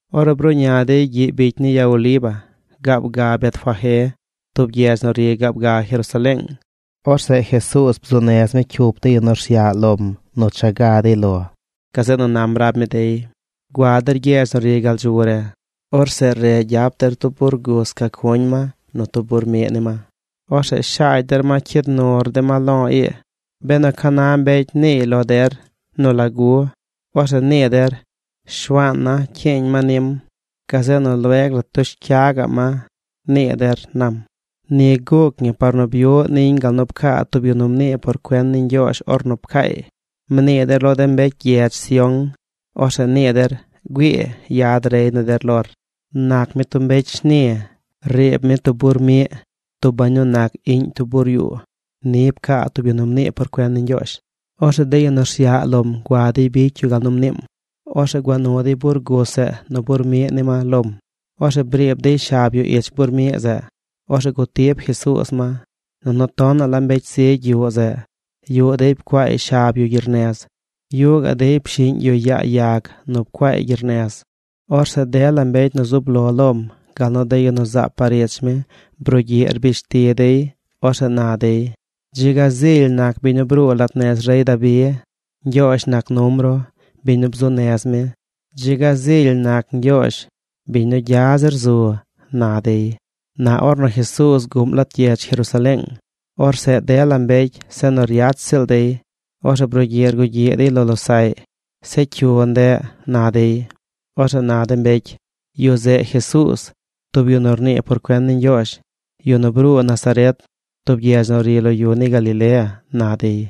Ornu bruꞌña dey gyiꞌ bicy ni ya Oliva gaab ga Betfagé, tub gyedz nu ri gaab ga Jerusaleeng, orzeꞌ Jesuuz bzuu nez mi cyup de yu nu rsyaꞌ lom nu cha ga dey lom. Gazeꞌ nu nam rab mi dey: ―Gua der gyedz nu ri gal dzu re. Orzeꞌ re gyap der tub bur gus ca cuñ ma nu tub bur miꞌ ni ma. Orzeꞌ shaagy der ma cyid nur de ma lo̱ ii. Benu ca na mbecy niiy lo der nu lagu, orzeꞌ nii der: “Shuaan na cyiiñ ma nim. Gazeꞌ nu lueg la tush cya gaꞌm ma”, nii der ―nam. Ni guuc ñi par nu byuꞌ niñ gal nu pcaa tub yu nu mnii por cuen ni Ñgyoozh ornu pcaay: Mnii der lo de mbecy gyedz Sión, orzeꞌ nii der: “Güii, yad rey ni der lor. Nac mi tub mbecy shni. Riib mi tub bur miꞌ, tub bañ nu nac iꞌñ tub bur yuu.” Ni pcaa tub yu nu mnii por cuen ni Ñgyoozh. Orzeꞌ de yu nu rsyaꞌ lom gua dey bicy yu gal nu mniim. Orzeꞌ gua nu dey bur gus zeꞌ nu bur miꞌ ni ma lom. Orzeꞌ briib dey shab yu ich bur miꞌ zeꞌ. Orzeꞌ gutib Jesuuz ma. Nunu tonaꞌ la mbecy zigy yuꞌ zeꞌ. Yuꞌ dey pcuaay shab yu gyernez. Yuꞌ gaꞌ dey pshiñ yu yaa yag nu pcuaay gyernez. Orzeꞌ dela mbecy nu zub lo lom, gal nu de yu nu zaab par ich mi brugyiꞌ rbish ti dey. Orzeꞌ na dey: ―¡Dzi ga zily nac biñ nu bruu lat nez rey Dabi! ¡Ñgyoozh nac num ru, biñ nu bzuꞌ nez mi! ¡Dzi ga zily nac Ñgyoozh, biñ nu gya zir zu! ―na dey. Na ornu Jesuuz guꞌm lat gyedz Jerusaleeng, orzeꞌ dela mbecy se nu ryach ziꞌl dey. Orzeꞌ brugyiꞌ rgugyiꞌ dey lo losaꞌy: ―¿Zeꞌ cyu ndeꞌ? ―na dey. Orzeꞌ na de mbecy: ―Yu zeꞌ Jesuuz, tub yu nu rnii por cuen ni Ñgyoozh, yu nu bruu Nazaret, tub gyedz nu ri lo yu ni Galilea ―na dey.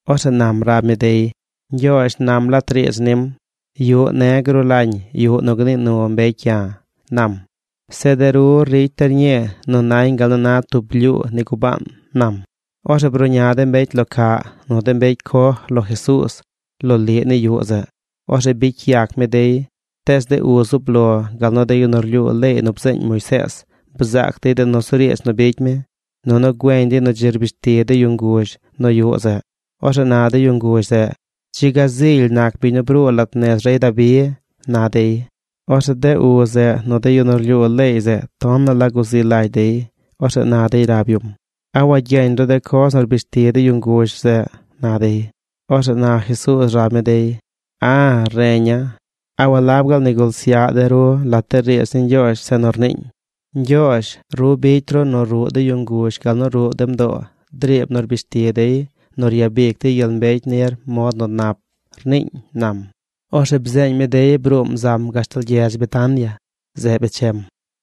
Orzeꞌ nam rab mi dey: ―Ñgyoozh nam lat riidz nim: “Yuꞌ ne̱ gruu lañ yuꞌ nu gnii nu mbecy ya̱”, nam. Zeꞌ de ru ricy der ñii nu nañ gal nu na tub blyuu ni gubaan ―nam. Orzeꞌ bruꞌña de mbecy lo caꞌ nu de mbecy coj lo Jesuuz loliꞌ ni yuꞌ zeꞌ. Orzeꞌ bicy yac mi dey. Tees de uz zub lo gal nu de yu nu rlyuu leey nu bzeeñ Moisees bzaac dey de nusuriidz nu bicy mi. Nunu güeñ dey nu dzi rbish ti de yu nguzh nu yuꞌ zeꞌ. Orzeꞌ na de yu nguzh zeꞌ: “¡Dzi ga zily nac biñ nu bruu lat nez rey Dabi!” na dey. Orzeꞌ de uz zeꞌ nu de yu nu rlyuu leey zeꞌ tonaꞌ la guzi lagy dey. Orzeꞌ na dey rab yum: ―¿A wagyeñ ru de coz nu rbish ti de yu nguzh zeꞌ? ―na dey. Orzeꞌ na Jesuuz rab mi dey: ―A̱, reña̱. ¿A walab gaal nigul syaꞌ de ru lat riidz ni Ñgyoozh zeꞌ nu rniiñ: Ñgyoozh, ru bicy ru nu ruꞌ de yu nguzh gal nu ruꞌ de mdoo driib nu rbish ti dey nu ryabic dey gyel mbecy nir mod nu nap, rniiñ? ―nam. Orzeꞌ bzeeñ mi dey bruum zam gashtal gyedz Betania. Zeꞌ bechem.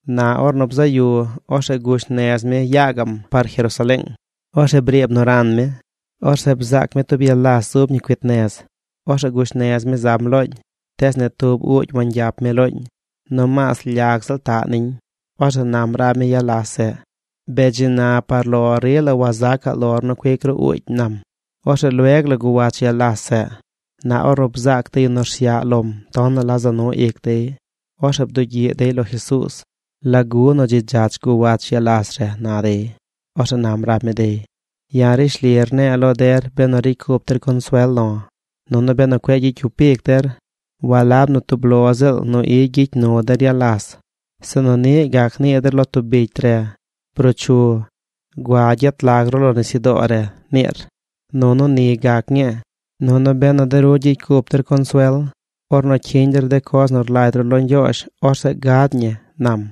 Na ornu bzaꞌ yu, orzeꞌ gush nez mi ya gaꞌm par Jerusaleeng. Orzeꞌ briib nu ran mi. Orzeꞌ bzaac mi tub ya las zub ñi cuit nez. Orzeꞌ gush nez mi zam looñ. Tees ni tub uugy wangyap mi looñ. Nomaas lyag ziꞌl taꞌ niñ. Orzeꞌ nam rab mi ya las zeꞌ: ―¡Bee dzi na par lo rila wazacaꞌ lor nu cuic ru uugy! ―nam. Orzeꞌ lueg la guwach ya las zeꞌ. Na ornu bzaac de yu nu rsyaꞌ lom tonaꞌ la za nu ic dey. Orzeꞌ bdugyiꞌ dey lo Jesuuz: ―¿Lagu nu dzi dzach guwach ya las re? ―na dey. Orzeꞌ nam rab mi dey: ―Ya̱ rishli rne̱e̱ lo der benu ricy cup der consuel lo̱, nunu benu cueꞌ gyicy cyup ic der, walab nu tub lo ziꞌl nu i gyicy nu der ya las, sinu niꞌ gac nii der lo tub bicy re: “Bruu chu. Gua gyet lag ru lo nisyudoo re”, niir, nunu ni gac ñii. Nunu benu de ru gyicy cup der consuel ornu cyiñ der de coz nu rlagy ru lo Ñgyoozh, orzeꞌ gad ñi ―nam.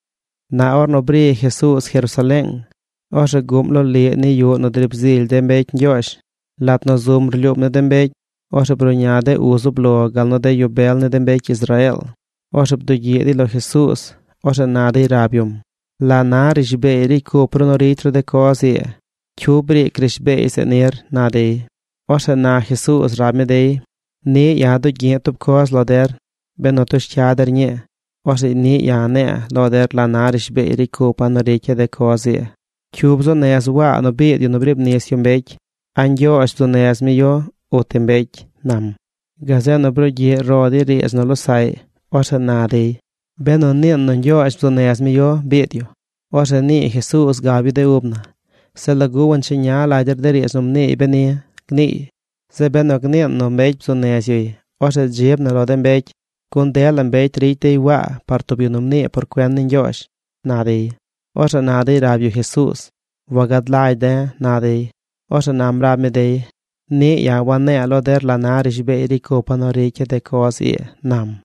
Na ornu bri Jesuuz Jerusaleeng, orzeꞌ guꞌm loliꞌ ni yuꞌ nu driib zily de mbecy Ñgyoozh. Lat nu zum rlyuum ni de mbecy, orzeꞌ bruꞌña de uz zub lo gal nu de yu bel ni de mbecy Israeel. Orzeꞌ bdugyiꞌ dey lo Jesuuz. Orzeꞌ na dey rab yum: ―¿La na rishbeey ricy cup ru nu ricy ru de coz ii? ¿Cyu briic rishbeey zeꞌ nir? ―na dey. Orzeꞌ na Jesuuz rab mi dey: ―Niꞌ ya̱ dugyi̱ꞌ tub coz lo der. Benu tush cya der ñii, orzeꞌ niꞌ ya̱ ne̱e̱ lo der la na rishbeey ricy cupa̱ nu ricya̱ de coz ii. ¿Cyu bzuu nez Waa nu biid yu nu briib nis yu mbecy? ¿A Ñgyoozh bzuu nez mi yu uti mbecy? ―nam. Gazeꞌ nu brugyiꞌ ro dey riidz nu losaꞌy. Orzeꞌ na dey: ―Benu niin nu Ñgyoozh bzuu nez mi yu biid yu, orzeꞌ nii Jesuuz gab yu de ub na: “Zeꞌ ¿lagu wancheña lagy der de riidz nu mniiy beni?” gniiy. Zeꞌ benu gniin nu mbecy bzuu nez yuy, orzeꞌ dzib na lo de mbecy, gun dela mbecy ricy dey Waa par tub yu nu mnii por cuen ni Ñgyoozh ―na dey. Orzeꞌ na dey rab yu Jesuuz: ―Wagad lagy de̱ ―na dey. Orzeꞌ nam rab mi dey: ―Niꞌ ya̱ wane̱e̱ lo der la na rishbeey ricy cupa̱ nu ricya̱ de coz ii ―nam.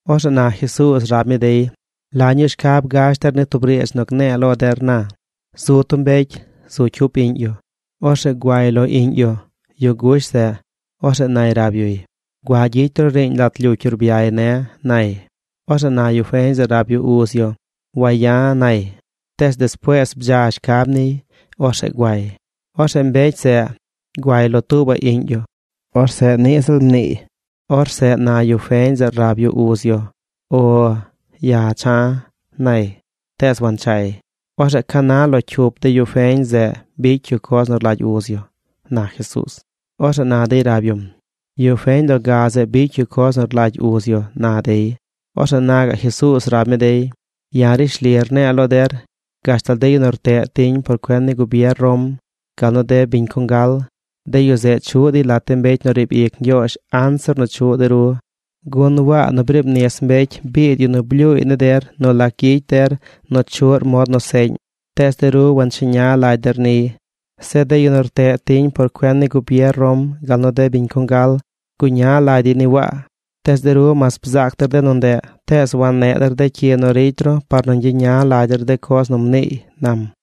Orzeꞌ na Jesuuz rab mi dey: ―¿La ñuu shcab gash der ni tub riidz nu gne̱e̱ lo der na? Zu tub mbecy. Zu cyup iꞌñ yu. Orzeꞌ guay lo iꞌñ yu, yu gush zeꞌ. Orzeꞌ nay rab yuy: “Gua gyicy ru riiñ lat lyucy urbyay ne̱”, nay. Orzeꞌ na yu feñ zeꞌ rab yu uz yu: “¡Waya̱!” nay. Tees despuees bdza shcab niy. Orzeꞌ guay. Orzeꞌ mbecy zeꞌ guay lo tuubaꞌ iꞌñ yu. Orzeꞌ niꞌ ziꞌl mniiy. Orzeꞌ na yu feñ zeꞌ rab yu Uz yu: “O. Ya̱ cha̱”, nay. Tees wanchay. ¿Orzeꞌ ca na lo cyup de yu feñ zeꞌ bicy yu coz nu rlagy uz yu? ―na Jesuuz. Orzeꞌ na dey rab yum: ―Yu feñ loga zeꞌ bicy yu coz nu rlagy uz yu ―na dey. Orzeꞌ na gaꞌ Jesuuz rab mi dey: ―Ya̱ rishli rne̱e̱ lo der gashtal de yu nu rteꞌ tiñ por cuen ni gubier Rom, gal nu de biñ congal, de yu zeꞌ chuꞌ dey lat de mbecy nu riib ic Ñgyoozh anzir nu chuꞌ de ru. Gun Waa nu briib nis mbecy biid yu nu blyuuy ni der nu lac gyicy der nu chuꞌr nu mod nu seꞌñ, tees de ru wancheña lagy der niy. Zeꞌ de yu nu rteꞌ tiñ por cuen ni gubier Rom, gal nu de biñ congal guña lagy dey ni Waa. Tees de ru mas bzaac der de nu ndeꞌ, tees wanneꞌ der de cyi nu ricy ru par nu ñgyeña lagy der de coz nu mniiy ―nam―.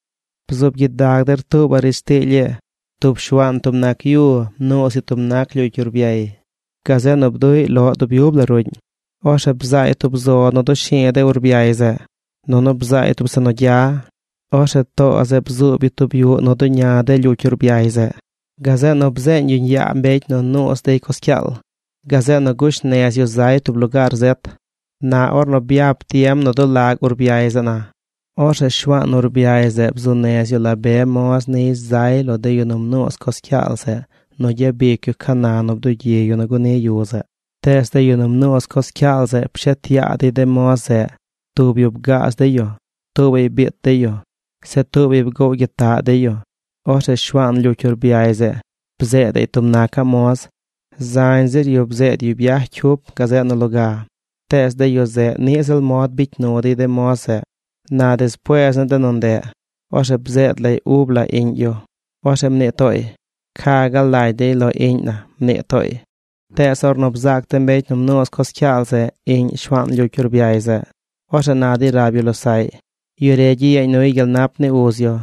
’Bzuub gyidag der tuubaꞌ riidz tiily ii: Tub shuaan tub nac yu mnuuz yu tub nac lyucy urbyay. Gazeꞌ nu bduꞌy loꞌ dub yub la ruꞌñ. Orzeꞌ bzaay tub zo nu dushu̱u̱ de urbyay zeꞌ. Nunu bzaay tub zeꞌ nu gya. Orzeꞌ too zeꞌ bzuub yu tub yuꞌ nu duña de lyucy urbyay zeꞌ. Gazeꞌ nu bzeeñ yuñ yaa mbecy nu nuuz dey coz cyaal. Gazeꞌ nu gush nez yu zay tub lugaar zet. Na ornu byap tiem nu dulag urbyay zeꞌ na, orzeꞌ shuaan urbyay zeꞌ bzuu nez yu la be moz niy zay lo de yu nu mnuuz coz cyaal zeꞌ nu gyabicy yu ca na nu bdugyi yu nu guni yu zeꞌ. Tees de yu nu mnuuz coz cyaal zeꞌ pshet yaa dey de moz zeꞌ. Tub yu bgaaz dey yu. Tuubaꞌy biit dey yu. Zeꞌ tuubaꞌy bgoow gyitaꞌ dey yu. Orzeꞌ shuaan lyucy urbyay zeꞌ bzeedaꞌy tub nacaꞌ moz. Zañ zir yu bzeed yu byaj cyup gazeꞌ nu loga, tees de yu zeꞌ niꞌ ziꞌl mod bicy nu dey de moz zeꞌ. ’Na despuees ni de nu ndeꞌ, orzeꞌ bzeed lay ub la iꞌñ yu. Orzeꞌ mnii tooy: “Ca gaal lagy dey lo iꞌñ na”, mnii tooy. Tees ornu bzaac de mbecy nu mnuuz coz cyaal zeꞌ, iꞌñ shuaan lyucy urbyay zeꞌ, orzeꞌ na dey rab yu losaꞌy: “Yu re gyiyeeñ nuy gyel nap ni uz yu.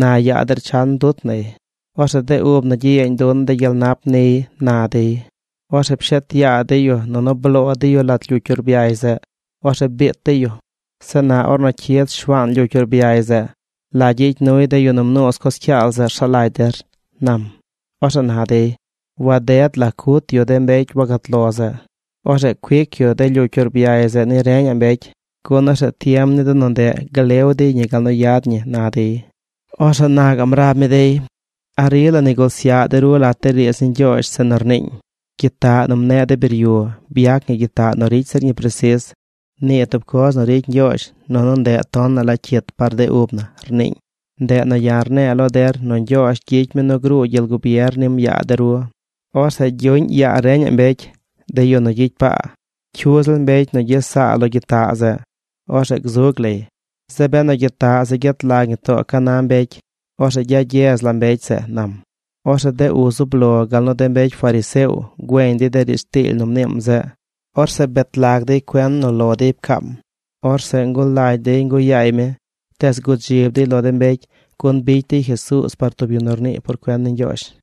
Na yaa der chan dut nay. Orzeꞌ de ub na gyiyeeñ dun de gyel nap niy”, na dey. Orzeꞌ pshet yaa dey yu nunu bloo dey yu lat lyucy urbyay zeꞌ. Orzeꞌ biit dey yu. ’Zeꞌ na ornu cyid shuaan lyucy urbyay zeꞌ, ¿la gyicy nuy de yu nu mnuuz coz cyaal zeꞌ rsaꞌ lagy der? ―nam. Orzeꞌ na dey: ―Waded la cut yu de mbecy wagat lo zeꞌ. Orzeꞌ cuic yu de lyucy urbyay zeꞌ ni reñaꞌ mbecy, gun orzeꞌ tiem ni de nu ndeꞌ glew dey ñi gal nu yad ñi ―na dey. Orzeꞌ na gaꞌm rab mi dey: ―¿A rila nigul syaꞌ de ru lat de riidz ni Ñgyoozh zeꞌ nu rniiñ: Gyitaꞌ nu mneꞌ de biryu byac ñi gyitaꞌ nu ricy zir ñi presis; nii tub coz nu ricy Ñgyoozh nunu ndeꞌ tonaꞌ la cyit par de ub na, rniiñ? Ndeꞌ nu ya̱ rne̱e̱ lo der nu Ñgyoozh gyicy mi nu gruu gyel gubier nim yaa de ru. Orzeꞌ gyuꞌñ yaa reñaꞌ mbecy, de yu nu gyicy paa. Cyu ziꞌl mbecy nu gyes saa lo gyitaꞌ zeꞌ, orzeꞌ gzug lay. Zeꞌ benu gyitaꞌ zeꞌ gyet lag ñi too ca na mbecy, orzeꞌ gyagyez la mbecy zeꞌ ―nam. Orzeꞌ de uz zub lo gal nu de mbecy fariseo güeñ dey de riidz tiily nu mniim zeꞌ. Orzeꞌ bet lag dey cuen nu lo dey pcaam. Orzeꞌ ngulagy dey nguꞌ yaay mi, tees gudzib dey lo de mbecy gun bicy dey Jesuuz par tub yu nu rnii por cuen ni Ñgyoozh.